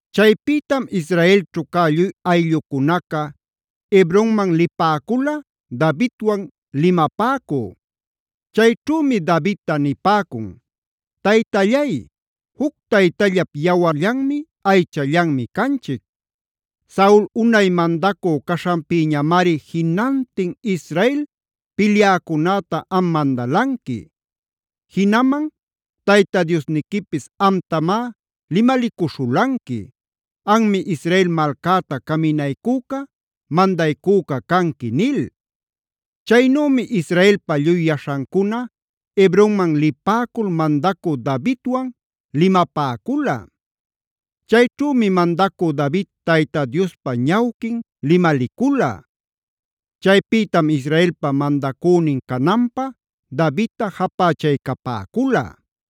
Chaypïtam Israelćhu cä lluy ayllucunaca Hebronman lipäcula Davidwan limapäcü. Chayćhümi Davidta nipäcun: “Taytallay, juc taytallap yawarllanmi, aychallanmi canchic. Saul unay mandacü caśhanpïñamari jinantin Israel pilyäcunäta am mandalanqui. Jinaman Tayta Diosniquipis amtamá limalicuśhulanqui: ‘Anmi Israel malcäta caminaycüca, mandaycüca canqui’” nil. Chaynümi Israelpa lluy yaśhancuna Hebronman lipäcul mandacü Davidwan limapäcula. Chayćhümi mandacü David Tayta Diospa ñawquin limalicula. Chaypïtam Israelpa mandacünin cananpä Davidta japächaycapäcula.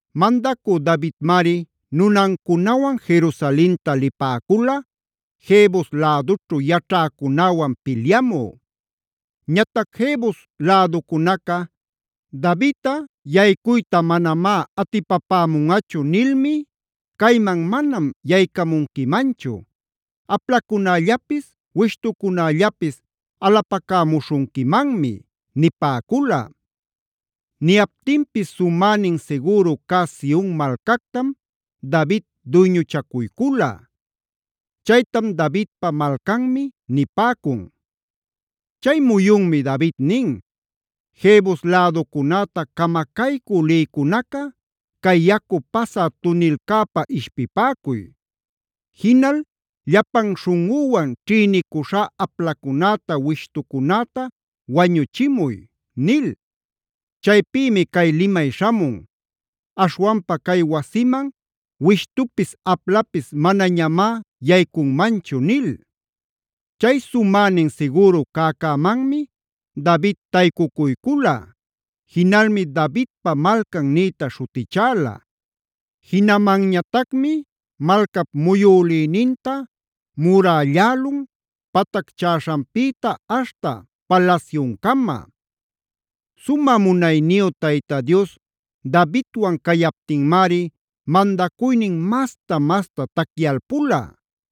Mandacü Davidmari nunancunawan Jerusalenta lipäcula Jebus lädućhu yaćhäcunäwan pilyamü. Ñatac Jebus läducunaca:b “Davidꞌa yaycuyta manamá atipapämunꞌachu nilmi: ‘Cayman manam yaycamunquimanchu. Aplacunällapis, wishtucunällapis alapacämuśhunquimanmi’” nipäcula. Niyaptinpis sumänin sigüru cä Sionc malcactam David duyñuchacuycula. Chaytam Davidpa Malcanmi nipäcun. Chay muyunmi David nin: “Jebus läducunäta camacaycü lïcunaca cay yacu pasä tunilcäpä ishpipäcuy. Jinal llapan śhunꞌüwan ćhïnicuśhá aplacunäta, wishtucunäta wañuchimuy” nil. Chaypïmi cay limay śhamun: “Aśhwanpa cay wasiman wishtupis, aplapis manañamá yaycunmanchu” nil. Chay sumänin sigüru cäcämanmi David taycucuycula; jinalmi Davidpa Malcan nïta śhutichäla. Jinamanñatacmi malcap muyülïninta murällälun patacchäśhanpïta aśhta palasyuncama. Sumä munayniyu Tayta Dios Davidwan cayaptinmari mandacuynin masta-masta tacyalpula.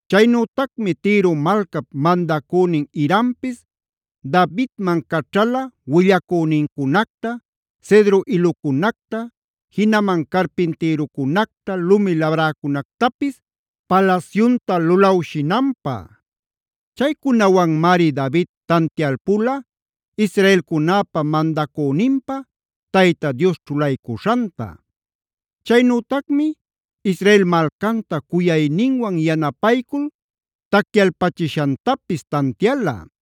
Chaynütacmi Tiro malcap mandacünin Hirampis Davidman caćhala willacünincunacta, cedro ilucunacta, jinaman carpintïrucunacta, lumi labräcunactapis palasyunta lulawshinanpä. Chaycunawanmari David tantialpula israelcunäpa mandacüninpä Tayta Dios ćhulaycuśhanta. Chaynütacmi Israel malcanta cuyayninwan yanapaycul tacyalpachishantapis tantiala.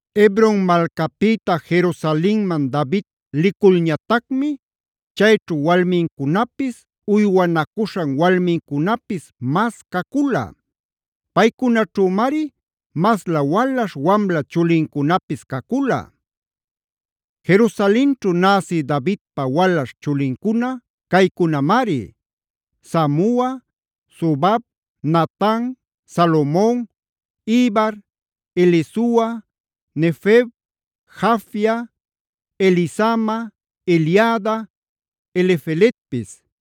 Hebron malcapïta Jerusalenman David liculñatacmi chayćhu walmincunapis uywanacuśhan walmincunapis mas cacula. Paycunaćhümari maslä walaśh wamla chulincunapis cacula. Jerusalenćhu näsi Davidpa walaśh chulincuna caycunamari: Samua, Sobab, Natan, Salomon, Ibhar, Elisua, Nefeg, Jafia, Elisama, Eliada, Elifeletpis.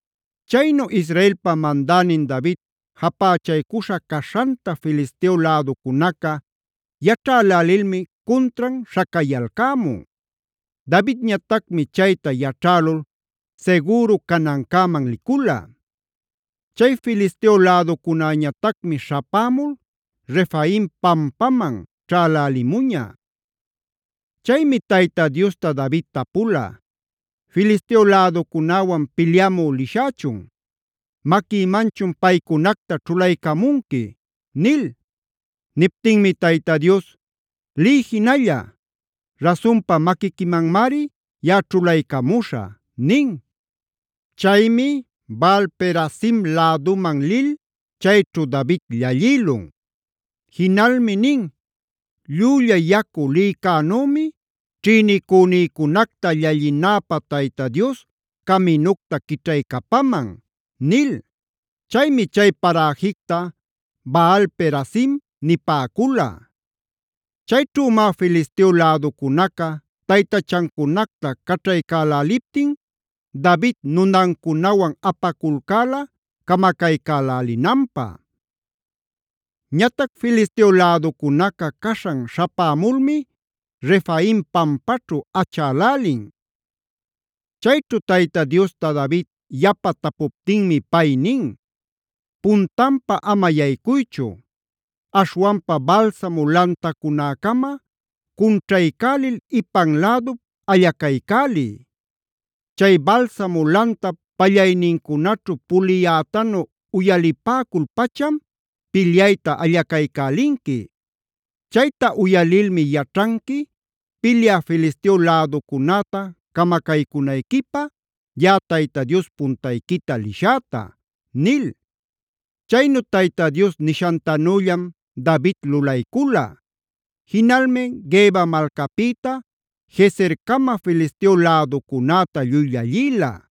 Chaynu Israelpa mandänin David japächaycuśha caśhanta Filisteo läducunaca yaćhälälilmi cuntran śhacayalcämun. Davidñatacmi chayta yaćhälul sigüru canancäman licula. Chay Filisteo läducunäñatacmi śhapämul Refaim pampaman ćhälälimuña. Chaymi Tayta Diosta David tapula: “¿Filisteo läducunäwan pilyamü lishächun? ¿Maquïmanchun paycunacta ćhulaycamunqui?” nil. Niptinmi Tayta Dios: “Liy jinalla. Rasunpa, maquiquimanmari yaꞌa ćhulaycamuśhä” nin. Chaymi Baal-perazim läduman lil chayćhu David llallïlun. Jinalmi nin: “Llülla yacu lïcänümi ćhïnicünïcunacta llallinäpä Tayta Dios caminucta quićhaycapaman” nil. Chaymi chay paräjicta Baal-perazimd nipäcula. Chayćhümá Filisteo läducunaca taytachancunacta caćhaycäläliptin David nunancunawan apaculcäla camacaycälälinanpä. Ñatac Filisteo läducunaca caśhan śhapämulmi Refaim pampaćhu achälälin. Chayćhu Tayta Diosta David yapa tapuptinmi pay nin: “Puntanpa ama yaycuychu. Aśhwanpa balsamo lantacunäcama cunćhaycälil ipan lädup allacaycäliy. Chay balsamo lantap pallaynincunaćhu puliyätanu uyalipäcul-pacham pilyayta allacaycälinqui. Chayta uyalilmi yaćhanqui, pilyä Filisteo läducunäta camacaycünayquipä yaꞌa Tayta Dios puntayquita lishäta” nil. Chaynu Tayta Dios nishantanüllam David lulaycula. Jinalmi Geba malcapïta Gezercama Filisteo läducunäta lluy llallïla.